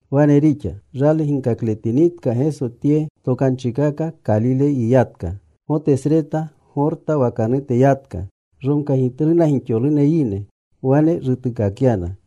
Wane rixa, rali ginkakletinitka Geso tye tokanchikaka, Kalile yiyatka. Gotesreta, Gorta wakanute yatka. Romkagitluna gixolune yine. Wane rutuukakyana.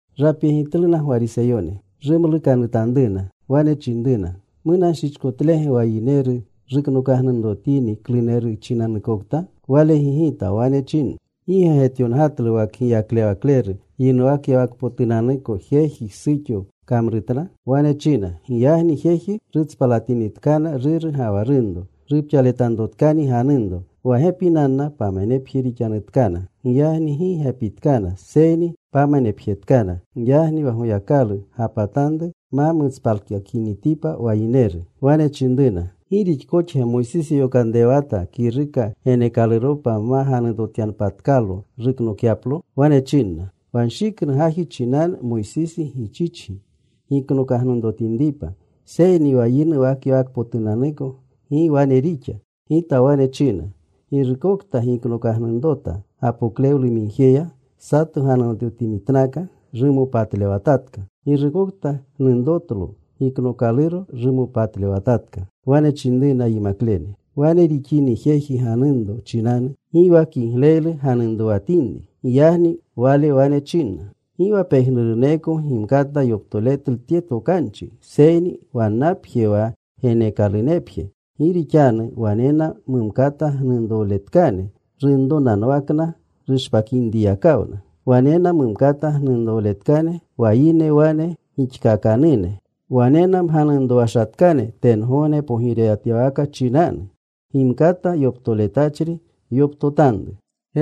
Rapyegitluna Gwariseyone. Rumlukanutanruna. Wane chinruna, “¿Munanshichkotlege wa yineru ruknokagnunrotini kluneru chinanukokta?” Wale gigita. Wane china, “¿Gi ge getyongatlu wa kgiyaklewakleru, yinuwakyawakpotunanuko jeji, suxo kamrutna? Wane china, ‘Giyagni jeji rutspalitinitkana ruru ga wa runro. Rupxaletanrotkani ganunro. Wa gepinanna pamanepje rixanutkana.’ Giyagni gi gepitkana, seyni pamanepjetkana. Giyagni wa Goyakalu gapatanru ma mutspalkakinitipa wa yineru.” Wane chinruna, “¿Gi rixkoxge Moysisi yokanrewata kiruka geneekaluropa ma ganunrotyanpatkalo, ruknokyaplo?” Wane chinna, “Wa nshiknu gaji chinanu Moysisi gichichgi giknokagnunrotinripa. Seyni wa yinuwakyawakpotunanuko gi wane rixa. Gita wane china, girukokta giknokagnunrota gapoklewlumigjeya, sato ganunrotinitnaka, rumopatlewatatka. Girukokta gnunrotlo giknookaluro rumopatlewatatka.” Wane chinruna yimaklene, “Wane rixini jeji ganunro chinanu, gi wa kigleylu ganunrowatinri.” Giyagni Wale wane chinna, “Gi wa pejnuruneko gimkata yoptoletlu tye tokanchi, seyni wannapje wa geneekalunepje. Gi rixanu wanena mumkata gnunrowletkane runronanwakna rushpakinyakawna. Wanena mumkata gnunrowletkane wa yine wane gixkakanune. Wanena mganunrowashatkane tengogne pogirewatyawaka chinanu. Gimkata yoptoletachri yoptotanru.”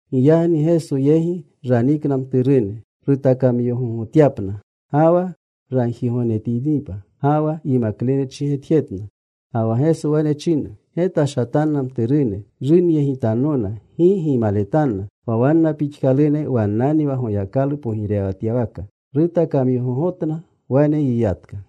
Giyagni Geso yegi raniikana mturune rutakamyogogotyapna, ga wa ragjigognetinripa. Ga wa yimaklene chigetjetna. Ga wa Geso wane china, “Getashatanna mturune runyegitannona. Gi gimaletanna. Wa wanna pixkalune wannanni wa Goyakalu pogirewatyawaka.” Rutakamyogogotna. Wane yiyatka.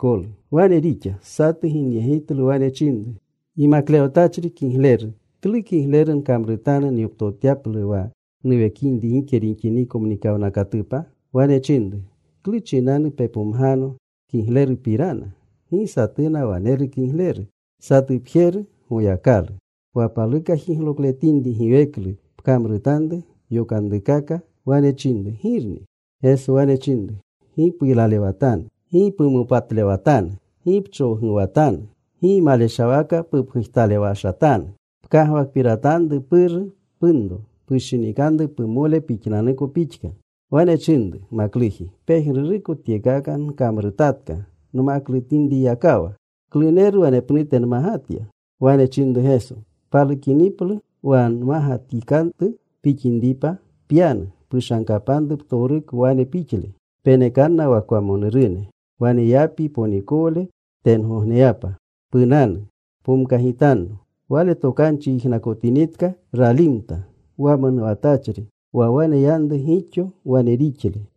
Wane rixa. Satu ginyegitlu. Wane chinru, “Yimaklewatachri kigleru, ¿klu kigleru nkamrutanu nyoptotyaplu wa nuwekinri gike rixiniko mnikawnakatupa?” Wane chinru, “¿Klu chinanu pepomgano kiglerupirana? Gi satuna waneru kigleru; satupjeru: Goyakalu. Wa paluka jiglokletinri giweklu, pkamrutanru yokanrukaka.” Wane chinru, “¿Girni?” Geso wane chinru, “Gi puylalewatanu. Gi pumopatlewatanu. Gi pchowguwatanu. Gi maleshawaka pupgujtalewashatanu. Pkagwakpiratanru puru, punro. Pushinikanru pumole pixananuko pixka.” Wane chinru makluji, “Pejnuruko tyekaka nkamrutatka nmaklutinyakawa. ¿Kluneru wanepnute nmagatya?” Wane chinru Geso, “Palukiniplu wa mmagatikatu pixinripa, pyanu. Pushankanru ptowruko wane pixle. Penekanna wa kwamonurune. Waneyapyi ponikowle tengogneyapa. Punanu. Pomkagitanno.” Wale tokanchi yijnakotinitka, ralimta wamonuwatachri, wa waneyanru gixo wane rixle.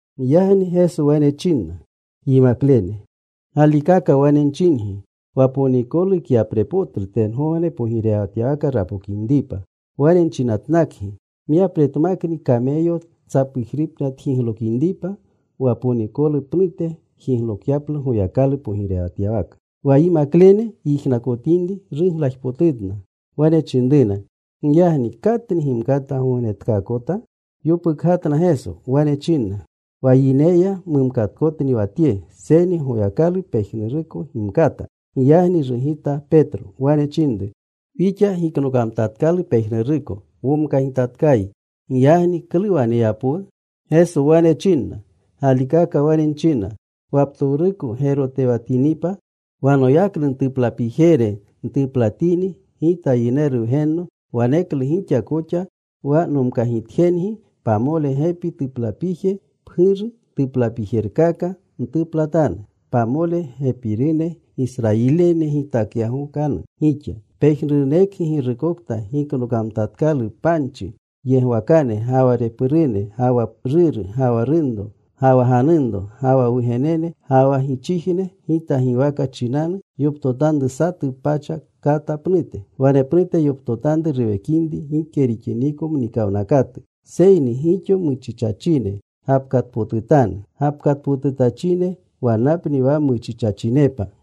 Giyagni Geso wane chinna yimaklene, “Galikaka wane nchingi, wa ponikolu kyaprepotlu tengogne pogirewatyawaka rapokinripa. Wane nchinatnakgi, myapretmakni kameyo tsapujripna tjiglokinripa, wa ponikolu pnute jiglokyaplu Goyakalu pogirewatyawaka.” Wa yimaklene yijnakotinri, ruglajpotutna. Wane chinruna, “Giyagni ¿katni gimkata gognetkaakota?” Yopukgatna Geso. Wane chinna, “Wa yineya mumkatkotni wa tye, seyni Goyakalu pejnuruko gimkata.” Giyagni rugita Petro. Wane chinru, “Wixa giknokamtatkalu pejnuruko. Womkagitatkayi. Giyagni ¿klu waneyapwu?” Geso wane chinna, “Galikaka wane nchina, wa ptowruko gerotewatinipa, wa noyaknu ntuplapijere ntuplatini Gita Yineru Wgenno, waneklu gixa koxa wa nomkagitjengi pamole gepi tuplapije, pguru tuplapijerkaka, ntuplatanu. Pamole gepinerune Gisrayiline gitakyagokanu gixa. Pejnuruneko girukokta giknokamtatkalu panchi, yegwakane ga wa repurune, ga wa ruru, ga wa runro, ga wa ganunro, ga wa wugenene, ga wa gichijne Gita giwaka chinanu, yoptotanru satu pacha kata pnute. Wanepnute yoptotanru ruwekinri gike rixiniko mnikawnakatu. Seyni gixo muchichachine gapkatpotutanu. Gapkatpotutachine wannapni wa muchichachinepa.